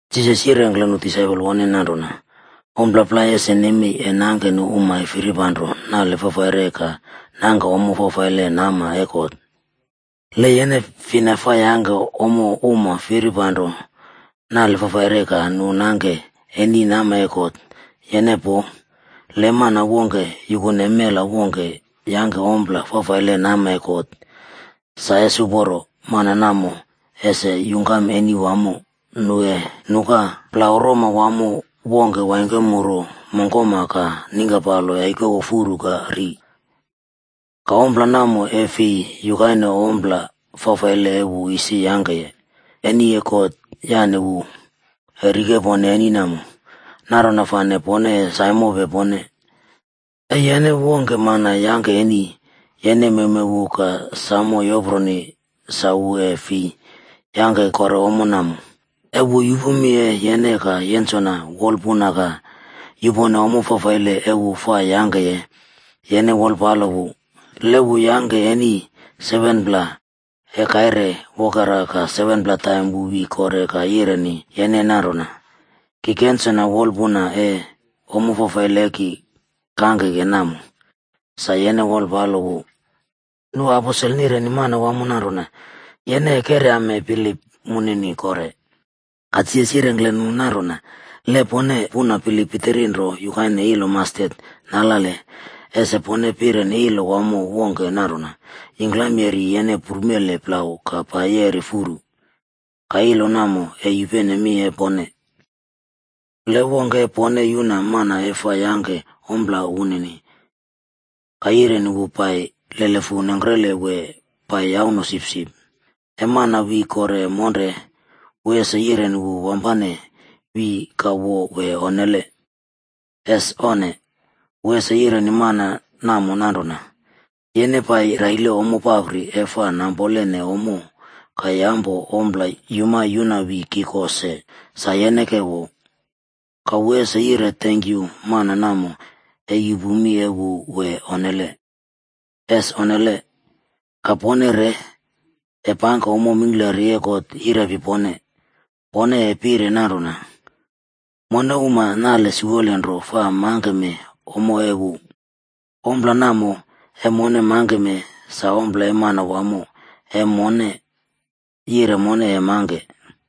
Jisas yirengkle nu disaipol woneni nanrona, “Ommo plai ese nemei e nangke nu uma e firipanro nale fafaire ka nangke ommo fafaile nama e God. Le yene fina fa yangke ommo uma firipanrone nale fafaile ka nu nangke eni nama e God, yene poo. Le mana wongke yukune mela wongke yangke ompla fafaile nama e God, sa ese uporo, mana namo ese yungkam eni wamo nu e nuka plau roma wamo wongke waingkemuru mongkoma ka ningkapalo yaikowo furu ka ri. Ka ompla namo, e fi yukaine ompla fafaile e wu isi yangkeye. Eni e God yane wu e rikepone eni namo. Nanrona fane pone e saimope pone. “E yene wongke mana yangke eni, yene mewmew wu ka sam yoproni sa wu e fi yangke kore ommo namo. E wu yupu mi e yene ka yensona wolpuna ka yupone ommo fafaile e wu fa yangkeye, yene wolpalo wu. Le wu yangke eni 7pla e kaire wokera ka 7pla taim wu wi kore ka yireni yene nanrona, ‘Ki kensona wolpuna e ommo fafaile e ki kangkeke namo,’ sa yene wolpalo wu.” Nu aposel nireni Manawamo nanrona, “Yene e keryame bilip munini kore.” Ka Jisas yirengkle nu nanrona, “Le pone puna bilip pitiri nro yukaine ilo mastet nalale, ese pone pireni ilo wamo wongke nanrona, ‘Yingklam yeri yene prumele plau ka pai yeri furu.’ Ka ilo namo e yupene mi e pone. “Le wongke e pone yuna mana e fa yangke ompla woneni, ka yireni wu pai lelefu nengkre wee pai yauno sipsip, e mana wi kore monre, wu ese yireni wu wampane wi ka wo wee onnele? Es onne! Wu ese yireni mana namo nanrona, ‘Yene pai raile ompla papri e fa nampolene ommo ka yampo ompla yuma yuna wi ki ko se, sa yene ke wo.’ Ka wu ese yire tenkyu mana namo e yupu mi e wu wee onnele? Es onnele! Ka pone re, e pangke ommo mingklari e God yirepi pone, pone e pire nanrona, ‘Mone uma nale siwole nro fa mangkeme ommo e wu. Ompla namo e mone mangkeme, sa ompla e Manwamo e mone yire mone e mangke.’”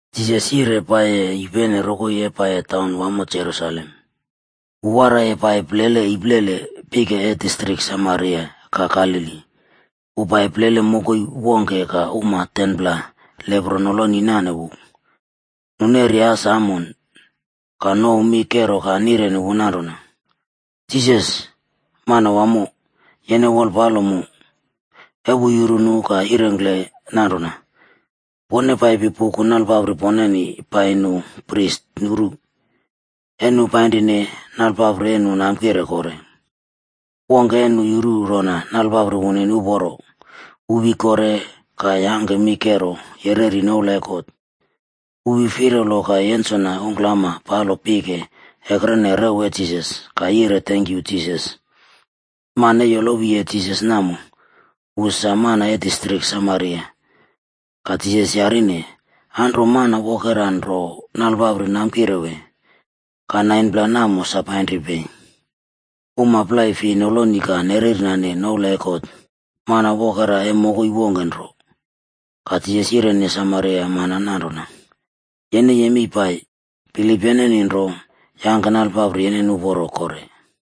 Jisas yire paiyi yupene rokoi e pai taun wamo Jerusalem. Wu waraiye pai plele iplele pike e distrik Samaria ka Galili. Wu pai plele mokoi wongke ka uma 10pla lepro noloni nane wu. Nu neri as amon. Ka nouw mi kero ka nireni wu nanrona, “Jisas, Manwamo, yene wolpalo mu.” E wu yuru nu ka yirengkle nanrona, “Pone paipi puku nalpapri poneni pai nu pris nuru.” E nu painrine, nalpapri e nu namkire kore. Wongke e nu yuru rona nalpapri woneni uporo, wu wi kore ka yangke mi kero yereri noula e God. Wu wi firalo ka yensona ungklama palo pike ekrene rew e Jisas ka yire tenkyu Jisas. Mana e yolowiye Jisas namo, wu sa mana e distrik Samaria. Ka Jisas yarine, “Anro, mana wokera nro nalpapri namkire wee? Ka 9pla namo sa painri pei? Uma plai fei noloni ka nerernane noula e God. Mana wokera e mokoi wongke nro.” Ka Jisas yireni Samaria mana nanrona, “Yene yemei pai, bilip yeneni nro yangke nalpapri yeneni uporo kore.”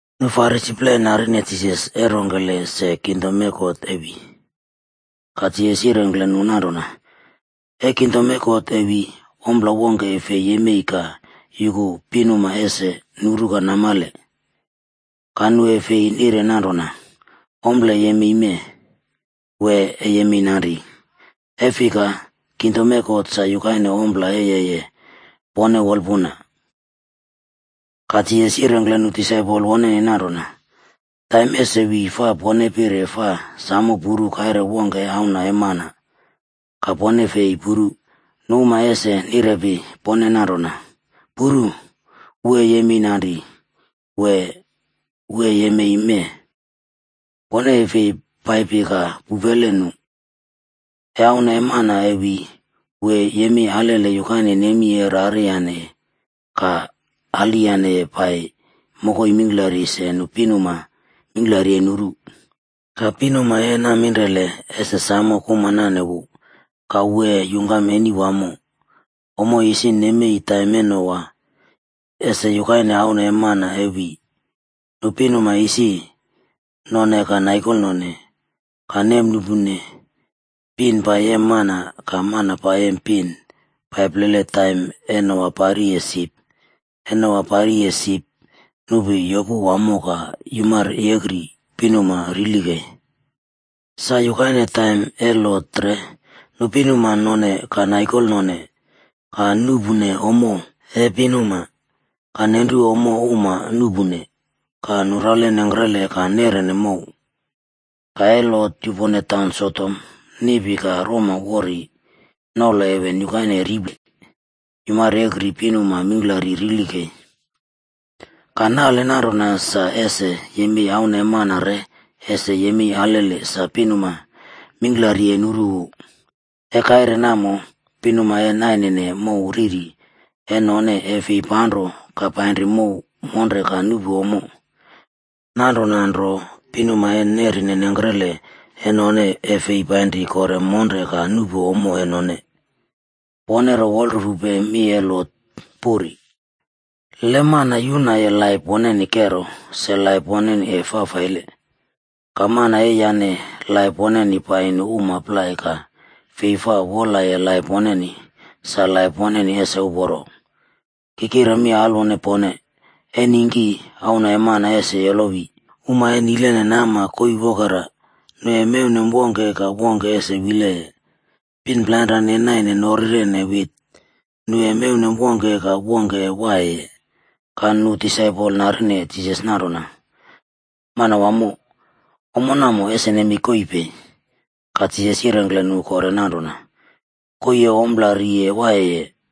Nu Farisi plai narine Jisas e rongkele se Kingdom e God e wi, ka Jisas yirengkle nu nanrona, “E kingdom e God e wi, ompla wongke e fei yemei ka yuku pinuma ese nuru ka namale. Ka nu e fei nire nanrona, ‘Ompla e yemei mee,’ wee ‘E yemei nanri,’ e fika, kingdom e God sa yukaine ompla e yeye pone wolpuna.” Ka Jisas yirengkle nu disaipol woneni nanrona, “Taim ese wi fa pone pire fa samo puru kaire wongke e Auna e Mana. Ka pone e fei puru. Nu uma ese nirepi pone nanrona, ‘Puru. Wu e yemei nari!’ wee ‘Wu e yemei mee!’ Pone e fei paipi ka pupele nu. E Auna e Mana e wi, wu e yemei alele yukaine nemi e rariyaneye ka aliyane pai mokoi mingklari se pinuma mingklari e nuru. Ka pinuma e naminrele ese samo kuma nane wu, ka wu e yungkam eni wamo. “Ommo isi nemei taim e Noa, ese yukaine Auna e Mana e wi. Nu pinuma isi none ka naikolnone, ka nemnuꞌpune, pin pai yem mana, ka mana pai yem pin pai plele taim e Noa pari sip. E Noa pariye sip, nupi yopu wamo ka yumaryekri pinuma rili kei. “Sa yukaine taim e Lot re.a Nu pinuma none, ka naikolnone, ka nuꞌpune ommo e pinuma, ka nenru ommo uma nuꞌpune, ka nura nengkrele ka neꞌrene mow. Ka e Lot yupone taun Sodom, niꞌpi ka roma wori nolo heven yukaine riple yumaryekri pinuma mingklari rili kei. “Ka nale nanrona sa ese yemei Auna e Mana re ese yemei alele sa pinuma mingklari e nuru wu. E kaire namo pinuma e nainene mow ririb e none e fi panro ka panri mow monre ka nuꞌpu ommo. Nanrona nro, pinuma e nerine nengkrele e none e fei painri kore monre ka nuꞌpu ommo e none. Pone ro wolrufupe mi e Lot puri!c Le mana yunaye laip woneni kero, se laip woneni e fafaile. Ka mana e yane laip woneni pai nu uma plai ka fei fa wolaye laip woneni, sa laip woneni ese uporo. “Ki kire mi alwone pone, e ningki Auna e Mana ese yolowi, uma e nile nama koii wokera, nu e mewnem wongke ka wongke ese wileye. Pin plainre e naine norirene wit, nu e mewnem wongke ka wongke e waiyeye.” Ka nu disaipol narine Jisas nanrona, “Manwamo, ommo namo ese nemei koii pei?” Ka Jisas yirengkle nu kore nanrona, “Koii e ompla ri waiyeye,